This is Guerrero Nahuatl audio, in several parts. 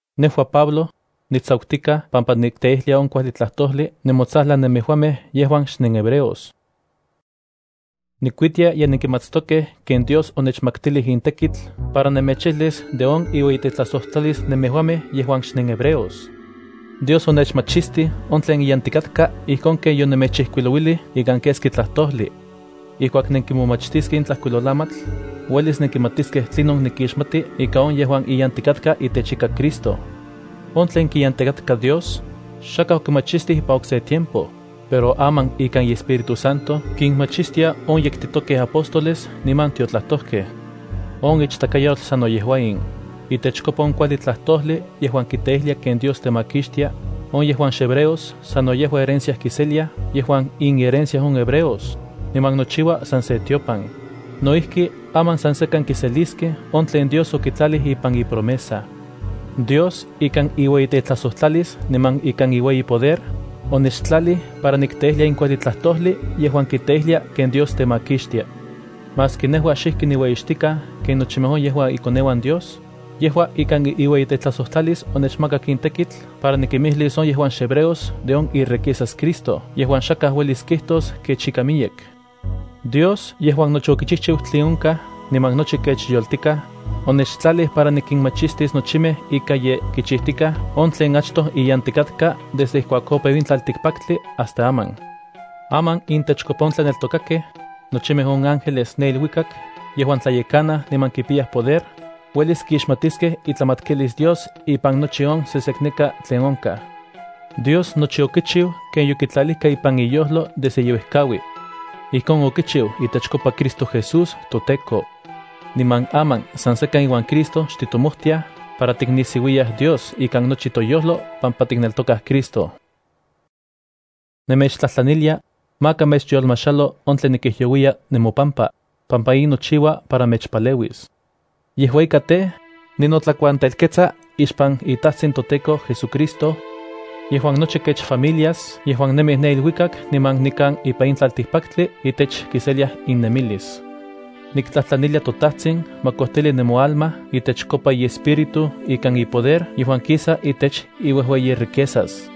Nejua Pablo, nitsakutikaj pampa nikteijlia on kuajli tlajtojli nemotsajlan nemejuamej yejuan xnenhebreos. Nikuitia ye nenkimatstokej ken Dios onechmaktilij in tekitl para nemechijlis de on iueyitetlajsojtlalis nemejuamej yejuan xnenhebreos. Dios onechmachistij on tlen iyantikatka ijkon ken yonemechijkuilouilij ikan keski tlajtojli. Ijkuak nenkimomachtiskej in tlajkuilolamatl, uelis nenkimatiskej tlinon nikixmati ika on yejuan iyantikatka itechika Cristo. On tlen kiyantikatka Dios, xakaj okimachistij ipan okse tiempo, pero aman ikan iEspíritu Santo kinmachistia on yektitokej apóstoles niman tiotlajtojkej. On ichtakayotl sano yejua in: Itechkopa on kuajli tlajtojli yejuan kiteijlia ken Dios temakixtia, on yejuan xhebreos sano yejua herencia kiseliaj yejuan inherencia on hebreos, niman nochiua san se tiopan. No ijki aman san sekan kiseliskej on tlen Dios okitlalij ipan ipromesa. Dios, ikan iueyitetlajsojtlalis niman ikan iueyipoder, onechtlalij para nikteijlia in kuajli tlajtojli yejuan kiteijlia ken Dios temakixtia. Maski nejua xijki niueyixtikaj ken nochimej on yejuan ikoneuan Dios, yejua ikan iueyitetlajsojtlalis onechmakak in tekitl para nikimijlis on yejuan xhebreos de on iriquezas Cristo yejuan xakaj uelis kijtos kech ika miyek. Dios yejuan nochi okichijchiu tlen onkaj niman nochi kech yoltikaj, onechtlalij para nikinmachistis nochimej ika ye kichijtikaj on tlen achtoj iyantikatka desde ijkuak opeu in tlaltikpaktli hasta aman. Aman intechkopa on tlaneltokakej, nochimej on ángeles ne iluikak yejuan tlayekanaj niman kipiyaj poder, uelis kixmatiskej itlamatkilis Dios ipan nochi on sesekneka tlen onkaj. Dios nochi okichiu ken yokitlalijka ipan iyojlo desde yeuejkaui. Ijkon okichiu itechkopa Cristo Jesús toTEKO. Niman aman san sekan iuan Cristo xtitomojtiaj para tiknisiuiyaj Dios ikan nochi toyojlo, pampa tikneltokaj Cristo. Nemechtlajtlanilia, maka mechyolmajxalo on tlen nikijyouiya nemopampa, pampa in nochiua para mechpaleuis. Yejua ika tej, ninotlakuantelketsa ixpan iTajtsin toTEKO JesuCristo, yejuan nochi kech familias yejuan nemij ne iluikak niman nikan ipan in tlaltikpaktli itech kiseliaj innemilis. Niktlajtlanilia toTajtsin ma kojtili nemoalma itechkopa iEspíritu ikan ipoder yejuan kisa itech iuejueyiriquezas,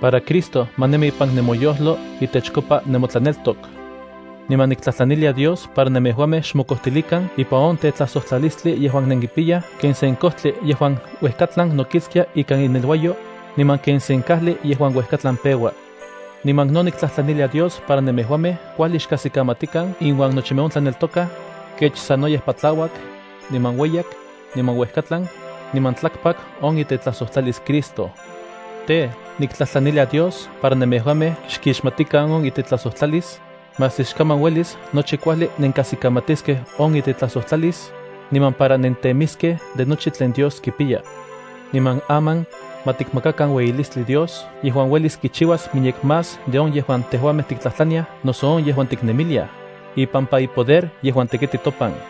para Cristo ma nemi ipan nemoyojlo itechkopa nemotlaneltok. Niman niktlajtlanilia Dios para nemejuamej xmokojtilikan ipan on tetlajsojtlalistli yejuan nenkipiyaj ken sen kojtli yejuan uejkatlan nokiktsia ikan ineluayo, niman ken sen kajli yejuan uejkatlan peua. Niman no niktlajtlanilia Dios para nemejuamej kuajli xkajsikamatikan inuan nochimej on tlaneltokaj, kech sanoyej patlauak, niman ueyak, niman uejkatlan, niman tlakpak on itetlajsojtlalis Cristo. Tej, niktlajtlanilia Dios para nemejuamej xkixmatikan on itetlajsojtlalis, maski xkaman uelis nochi kuajli nenkajsikamatiskej on itetlajsojtlalis, niman para nentemiskej de nochi tlen Dios kipiya. Niman aman, ma tikmakakan ueyilistli Dios yejuan uelis kichiuas miyek más de on yejuan tejuamej tiktlajtlaniaj noso on yejuan tiknemiliaj, ipampa ipoder yejuan tekiti topan.